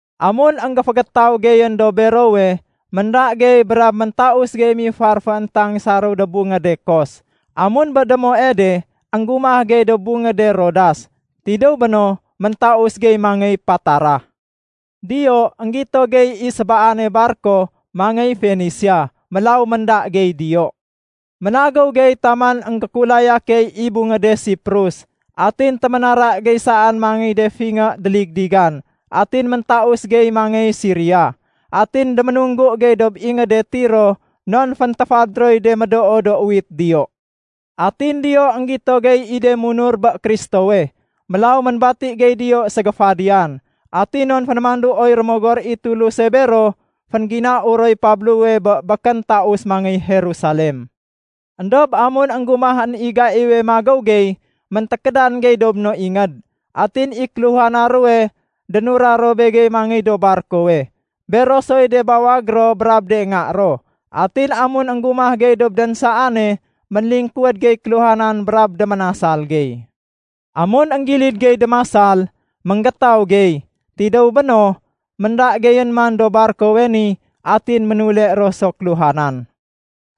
Amun énggéfégétaw geyén dob berowe, ménda gey brab méntaus gey mifar fééntang saréw dob bungéde Kos. Amun bé démoe de énggumah gey dob bungéde Rodas. Tidéw béno méntaus gey mangéy Patara. Diyo énggito gey i sébaane barko mangéy Fenisia, mélaw ménda gey diyo. Ménagéw gey taman énggékulaya key i bungéde Siprus, atin téménara gey saén mangéy de fingé déligdigan atin méntaus gey mangéy Siria. Atin déménunggu gey dob ingéde Tiro non féntéfad roy de médoo do uwit diyo. Atin diyo énggito gey i de munur bé Kristowe, mélaw ménbati gey diyo ségéfadiyan. Atin non fénémanduoy Rémogor i Tuluse bero, féngginau roy Pablowe bé békén taus mangéy Jerusalem. Endob amun énggumahén i gaiwe magéw gey, méntékédan gey dob no inged. Atin i kéluhana ruwe dénura ro begey mangéy dob barkowe, bero soy de bawag ro brab de nga ro. Atin amun énggumah gey dob dénsaane, ménlingkuwéd gey kéluhanan brab déménasal gey. Amun énggilid gey démasal, ménggétaw gey. Tidéw béno, ménda geyén man dob barkowe ni, atin ménule ro so kéluhanan.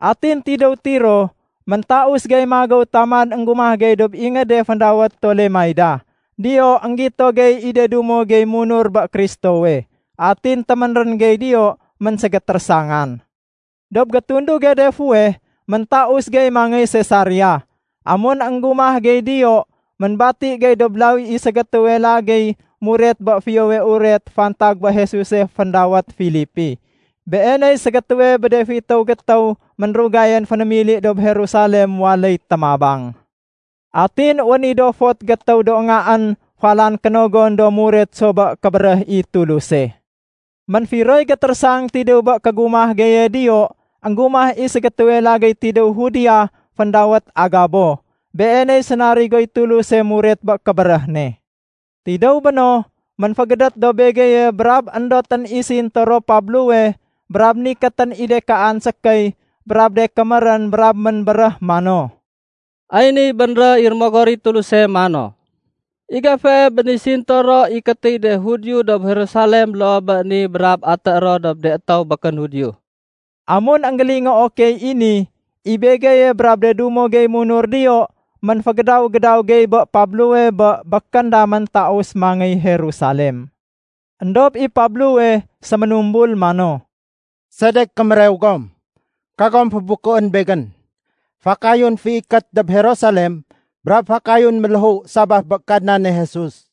Atin tidéw Tiro méntaus gey magéw taman énggumah gey dob ingéde féndawét Tolemaida. Diyo énggito gey i de dumo gey munur bé Kristowe. Atin téménrén gey diyo ménségétérésangan. Dob gétunduge de fuweh, méntaus gey mangéy Sesaria. Amun énggumah gey diyo, ménbati gey dob lawi i ségétéwe lagéy muret bé Fiyowe Uret fantag bé Jesuse féndawét Filipi. Beeney ségétéwe bé de fitéw gétéw ménrugayén fénémili dob Jerusalem waléy témabang. Atin wén i do fot gétéw do ngaén falan kénogon do muret so bé kébéréh i Tuluse. Ménfiroy gétérésang tidéw bé kégumah geye diyo, énggumah i ségétéwe lagéy tidéw Judea féndawét Agabo. Beeney sénarigoy Tuluse muret bé kébéréh ne. Tidéw béno, ménfégédét dob begeye brab éndotén i sintoro Pablowe brab nikétén i de kaan sékéy brab de kémérén brab ménbéréh mano, “Ay niy bénréh i Rémogor i Tuluse mano, ‘I gefee bé ni sintoro ikétéy de Judio dob Jerusalem loo bé ni brab atéé ro dob de étéw békén Judio.’” Amun énggélingoo key i ni, i begeye brab de dumo gey munur diyo ménfégédaw-gédaw gey bé Pablowe bé békén damén taus mangéy Jerusalem. Endob i Pablowe séménumbul mano, “Sedek kémérew gom? Kagom fébukuén begén! Fakayun féikét dob Jerusalem brab fakayun méléhu sabaf bé Kadnane Jesus.”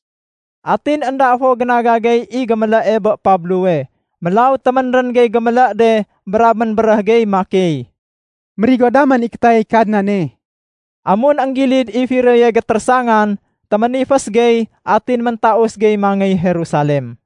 Atin énda fo génaga gey i gémélée bé Pablowe. Mélaw téménrén gey gémélé de brab ménbéréh gey makey, “Mérigo damén i kétayay Kadnane.” Amun énggilid i firoye gétérésangan, téménifés gey atin méntaus gey mangéy Jerusalem.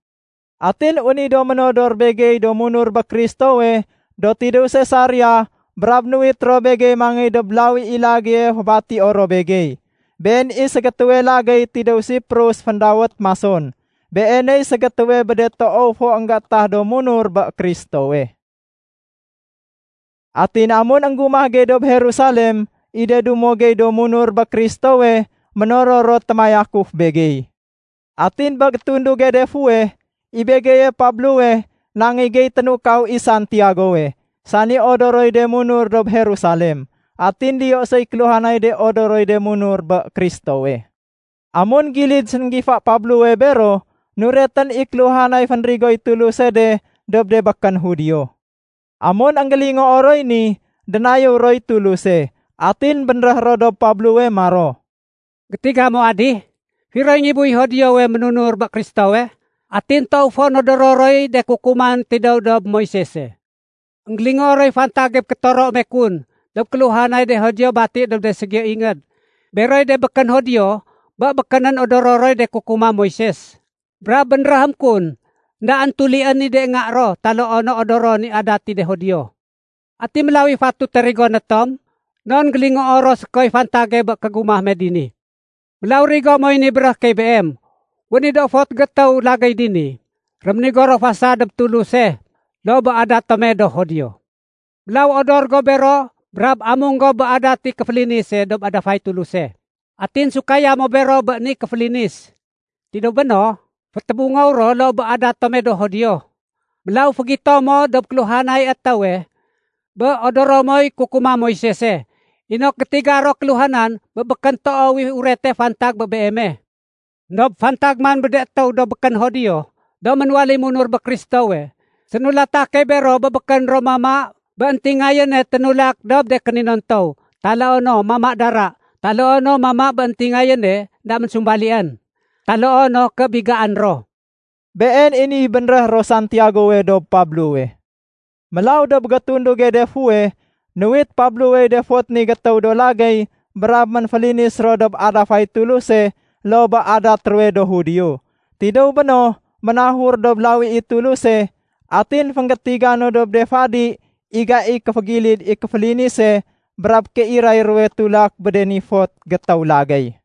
Atin wén i do ménodor begey do munur bé Kristowe do tidéw Sesaria brab nuwit ro begey mangéy dob lawi i lagéye fébatio ro begey. Been i ségétéwe lagéy tidéw Siprus féndawét Mason. Beeney ségétéwe bé de toow fo énggétah do munur bé Kristowe. Atin amun énggumah gey dob Jerusalem, i de dumo gey do munur bé Kristowe ménoror ro témayakuf begey. Atin bé gétunduge de fuweh, i begeye Pablowe nangéy gey ténukaw i Santiagowe, sani odoroy de munur dob Jerusalem. Atin diyo soy kéluhanay de odoroy de munur bé Kristowe. Amun gilid sénggifa Pablowe bero, nuretén i kéluhanay fénrigoy Tuluse de dob de békén Judio. Amun énggélingoo roy ni, dénayéw roy Tuluse. Atin bénréh ro dob Pablowe maro, “Gétiga mo adih, firoy ngibuy Judiowe ménunur bé Kristowe, atin toow fo nodoro roy de kukuman tidéw dob Moisese. Enggélingoo roy fantage bé kétoro me kun dob kéluhanay de Judio bati dob de ségiyo ingéd beroy de békén Judio bé békénén odoro roy de kukuma Moises. Brab bénréhém kun éndaén tulién i de nga ro taloo no odoron i adat i de Judio. Ati mélaw i fatute rigoné tom? Non gélingoo ro sékoy fantage bé kégumah me dini. Mélaw rigo moy ni béréhé key beem. Wén i do fot gétéw lagéy dini, réménigo ro fasad dob Tuluse loo bé adat tome do Judio. Mélaw odor go bero brab amung go bé adat i kéfélinise dob adafay Tuluse. Atin sukaya mo bero bé ni kéfélinis. Tidéw béno, fétébungow ro loo bé adat tome do Judio. Mélaw fégito mo dob kéluhanay étéwe bé odoro moy kukuma Moisese, inok gétiga ro kéluhanan bé békén toow i urete fantag bé beeme. Endob fantag man bé de étéw do békén Judio do ménwaléy munur bé Kristowe, sénulata key bero bé békén ro mama bé éntingayéne ténulak dob de kéninontow, taloo no mama dara, taloo no mama bé éntingayéne énda ménsumbalién, taloo no ké bigaén ro.” Been i niy bénréh ro Santiagowe dob Pablowe. Mélaw dob gétunduge de fuweh, nuwit Pablowey de fot ni gétéw do lagéy brab ménfélinis ro dob adafay Tuluse loo bé adat ruwe do Judio. Tidéw béno ménahur dob lawi i Tuluse, atin fénggétiga no dob de fadi i gaiy kéfégilid i kéfélinise brab kéiray ruwe tulak bé de ni fot gétéw lagéy.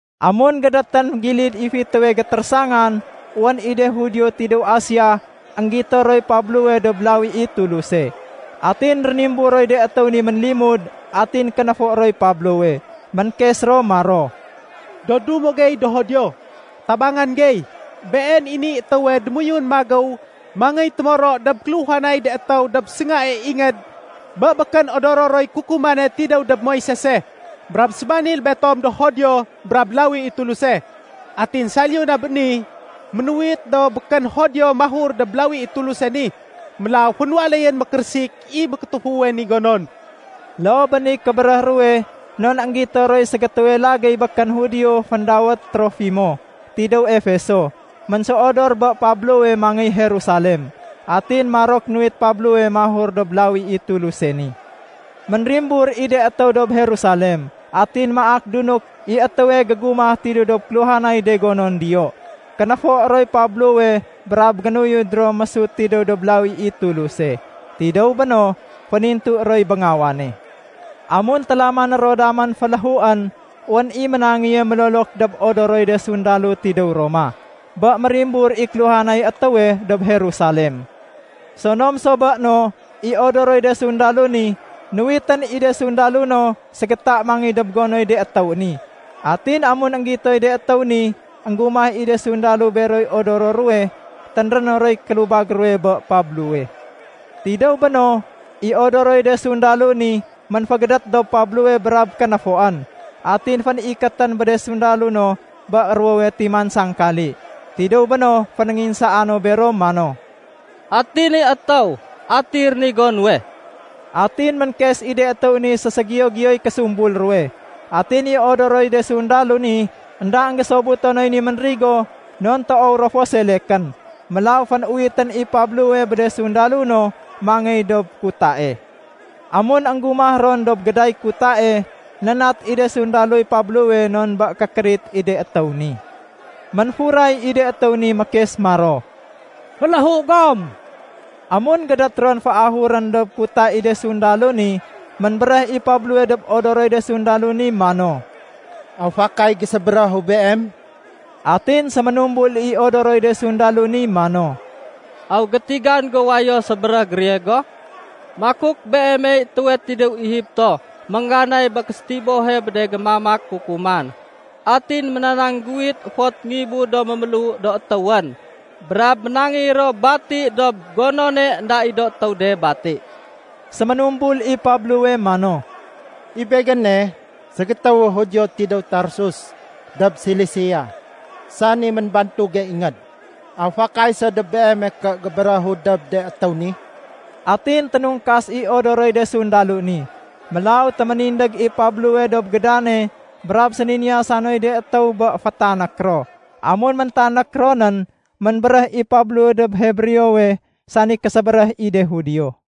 Amun gédétén gilid i fitéwe gétérésangan, wén i de Judio tidéw Asia énggito roy Pablowe dob lawi i Tuluse. Atin rénimbur roy de étéw ni ménlimud atin kénéfo roy Pablowe. Ménkes ro maro, “Do dumo gey do Judio, tabangan gey! Been i niy étéwe démoyun magéw mangéy témoro dob kéluhanay de étéw dob séngae ingéd bé békén odoro roy kukumane tidéw dob Moisese. Brab sébanil betom do Judio brab lawi i Tuluse. Atin saliyu na bé ni, ménuwit do békén Judio mahur dob lawi i Tuluse ni. Mélaw fénwaléyén mékérésik i mékétéfuwe ni gonon.” (Loo bé niy kébéréh ruwe non énggito roy ségétéwe lagéy békén Judio féndawét Trofimo tidéw Efeso ménséodor bé Pablowe mangéy Jerusalem. Atin marok nuwit Pablowe mahur dob lawi i Tuluse ni.) Ménrimbur i de étéw dob Jerusalem. Atin maak dunuk i étéwe gégumah tidéw dob kéluhanay de gonon diyo. Kénéfo roy Pablowe brab génuyud ro mésut tidéw dob lawi i Tuluse. Tidéw béno, fénintu roy béngawane. Amun télamané ro damén féléhuén, wén i ménangéye mélolok dob odoroy de sundalo tidéw Roma, bé mérimbur i kéluhanay étéwe dob Jerusalem. Sonom so béno, i odoroy de sundalo ni, nuwitén i de sundalo no ségéta mangéy dob gonoy de étéw ni. Atin amun énggitoy de étéw ni énggumah i de sundalo beroy odoro ruwe, ténréno roy kélubag ruwe bé Pablowe. Tidéw béno, i odoroy de sundalo ni, ménfégédét dob Pablowe brab kénéfoén. Atin fénikétén bé de sundalo no bé ruwowe timan sangkali. Tidéw béno fénénginsaa no bero mano, “Ati ni étéw? Ati rénigo nuwe?” Atin ménkes i de étéw ni séségiyo-giyoy késumbul ruwe. Atin i odoroy de sundalo ni énda énggésobuto noy ni ménrigo non toow ro fo selekén. Mélaw fénuwitén i Pablowe bé de sundalo no mangéy dob kutae. Amun énggumah ron dob géday kutae, nénat i de sundaloy Pablowe non bé kékérit i de étéw ni. Ménfuray i de étéw ni mékes maro, “Féléhu gom!” Amun gédét ron féahurén dob kuta i de sundalo ni, ménbéréh i Pablowe dob odoroy de sundalo ni mano, “Aw fakay gésébéréhu beem?” Atin séménumbul i odoroy de sundalo ni mano, “Aw gétigan go wayo sébéréh Griego? Makuk beemey étéwe tidéw Egipto méngganay bé késétibohe bé de gémamak kukuman. Atin ménanangguwit fot ngibu do méméléhu do étéwén brab ménangéy ro bati dob gonone énda i do étéw de bati.” Séménumbul i Pablowe mano, “I begéne, ségétéwu Judio tidéw Tarsus dob Silisia, sani ménbantuge ingéd. Aw fakay so dob beeme ké gébéréhu dob de étéw ni?” Atin ténungkas i odoroy de sundalo ni. Mélaw téménindég i Pablowe dob gédane brab séniniyasa noy de étéw bé fétanék ro. Amun méntanék ronén, ménbéréh i Pablowe dob Hebreowe, sani késébéréh i de Judio.